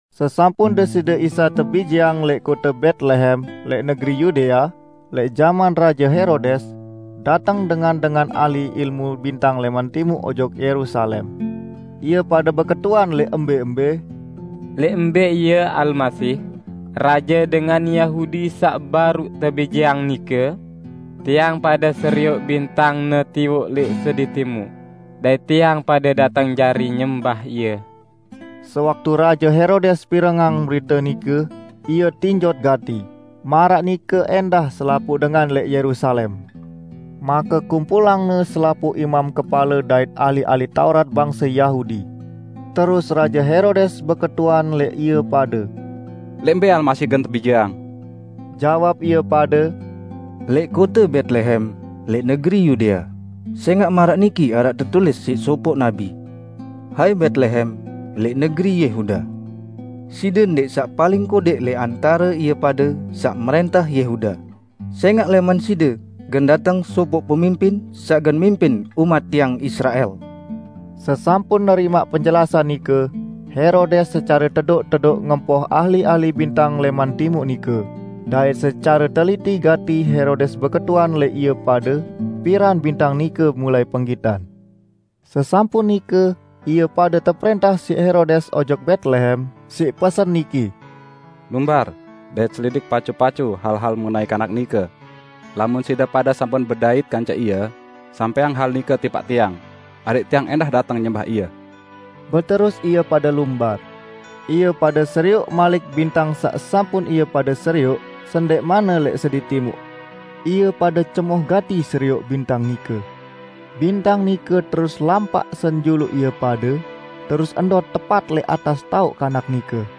Sesampun Deside Isa tebijeang lẽq kote Betlehem lẽq negeri Yudea, lẽq jaman Raje Herodes, dateng dengan-dengan ahli ilmu bintang lẽman Timuq ojok Yerusalem. Ie pade beketuan lẽq embẽ-embẽ, "Lẽq mbẽ Ie, Almasih, raje dengan Yahudi saq baruq tebijeang nike? Tiang pade serioq bintang-Ne tiwoq lẽq sedi timuq, dait tiang pade dateng jari nyembah Ie." Sewaktu Raje Herodes pirengang berite nike, ie tinjot gati, maraq nike ẽndah selapuq dengan lẽq Yerusalem. Make kumpulangne selapuq imam kepale dait ahli-ahli Taurat bangse Yahudi. Terus Raje Herodes beketuan lẽq ie pade, "Lẽq mbẽ Almasih gen tebijeang?" Jawab ie pade, "Lẽq kote Betlehem, lẽq negeri Yudea. Sẽngaq maraq niki araq tetulis siq sopoq nabi, 'Hai Betlehem, lẽq negeri Yehuda, side ndẽq saq paling kodẽq lẽq antare ie pade saq mrẽntah Yehuda. Sẽngaq lẽman side gen dateng sopoq pemimpin saq gen mimpin umat Tiang Israel.' " Sesampun nerimaq penjelasan nike, Herodes secare tedoq-tedoq ngempoh ahli-ahli bintang lẽman Timuq nike, dait secare teliti gati Herodes beketuan lẽq ie pade, piran bintang nike mulai penggitan. Sesampun nike ie pade teprẽntah siq Herodes ojok Betlehem, siq pesen niki, "Lumbar dait selidik pacu-pacu hal-hal mengenai Kanak nike. Lamun side pade sampun bedait kance Ie, sampẽang hal nike tipaq tiang, adẽq tiang ẽndah dateng nyembah Ie." Beterus ie pade lumbar. Ie pade serioq malik bintang saq sampun ie pade serioq sendẽqmanne lẽq sedi timuq. Ie pade cemoh gati serioq bintang nike! Bintang nike terus lampaq senjuluq ie pade, terus ndot tepat lẽq atas taoq Kanak nike.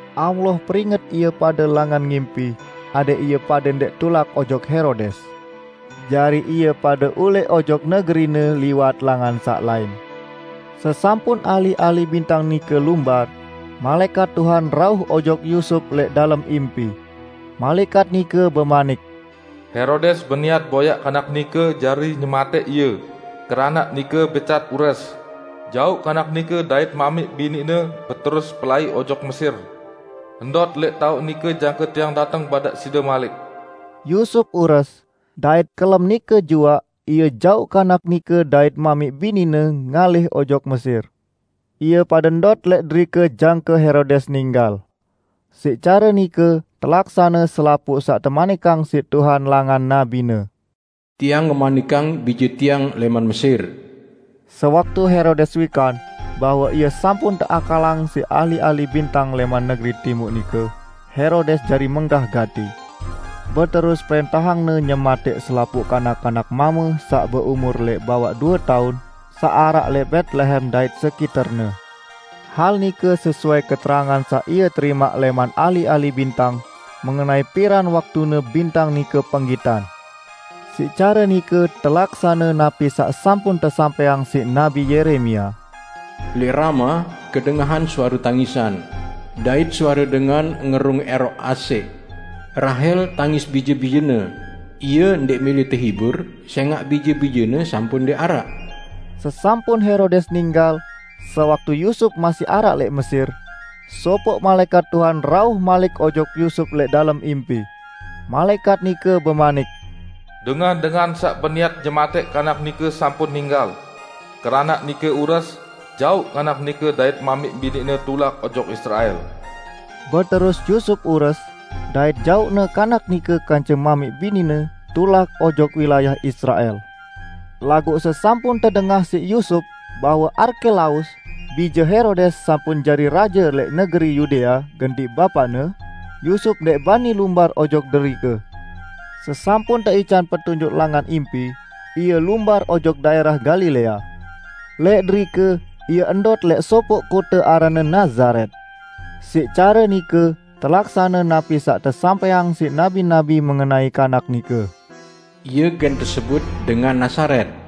Allah peringet ie pade langan ngimpi adẽq ie pade ndẽq tulak ojok Herodes. Jari ie pade ulẽq ojok negerine liwat langan saq lain. Sesampun ahli-ahli bintang nike lumbar, malaẽkat Tuhan rauh ojok Yusup lẽq dalem impi. Malaẽkat nike bemanik, "Herodes beniat boyaq Kanak nike jari nyematẽq Ie, keranaq nike becat ures, jauq Kanak nike dait mamiq bini-Ne beterus pelai ojok Mesir. Ndot lẽq taoq nike jangke Tiang dateng badaq side malik." Yusup ures, dait kelem nike juaq ie jauq Kanak nike dait mamiq bini-Ne ngalih ojok Mesir. Ie pade ndot lẽq derike jangke Herodes ninggal. Siq care nike telaksane selapuq saq temanikang siq Tuhan langan nabi-Ne, "Tiang ngemanikang Bije Tiang lẽman Mesir." Sewaktu Herodes wikan bahwe ie sampun teakalang siq ahli-ahli bintang lẽman negeri timuq nike, Herodes jari menggah gati. Beterus prẽntahangne nyematẽq selapuq kanak-kanak mame saq beumur lẽq bawaq due taun saq araq lẽq Betlehem dait sekiterne. Hal nike sesuai keterangan saq ie terimaq lẽman ahli-ahli bintang, mengenai piran waktune bintang nike penggitan. Siq care nike telaksane napi saq sampun tesampẽang siq Nabi Yeremia, "Lẽq Rama kedengahan suare tangisan, dait suare dengan ngerung ẽroq asẽq. Rahel tangis bije-bijene; ie ndẽq mẽlẽ tehibur sẽngaq bije-bijene sampun ndẽq araq." Sesampun Herodes ninggal, sewaktu Yusup masih araq lẽq Mesir, sopoq malaẽkat Tuhan rauh malik ojok Yusup lẽq dalem impi. Malaẽkat nike bemanik, "Dengan-dengan saq beniat nyematẽq Kanak nike sampun ninggal. Keranaq nike ures, jauq Kanak nike dait mamiq bini-Ne tulak ojok Israel." Beterus Yusup ures, dait jauqne Kanak nike kance mamiq bini-Ne tulak ojok wilayah Israel. Laguq sesampun tedengah siq Yusup bahwe Arkelaus, bije Herodes sampun jari raje lẽq negeri Yudea gentiq bapaqne, Yusup ndẽq bani lumbar ojok derike. Sesampun teican petunjuk langan impi, ie lumbar ojok daẽrah Galilea. Lẽq derike ie ndot lẽq sopoq kote aranne Nazaret. Siq care nike telaksane napi saq tesampẽang siq nabi-nabi mengenai Kanak nike: "Ie gen tesebut Dengan Nazaret."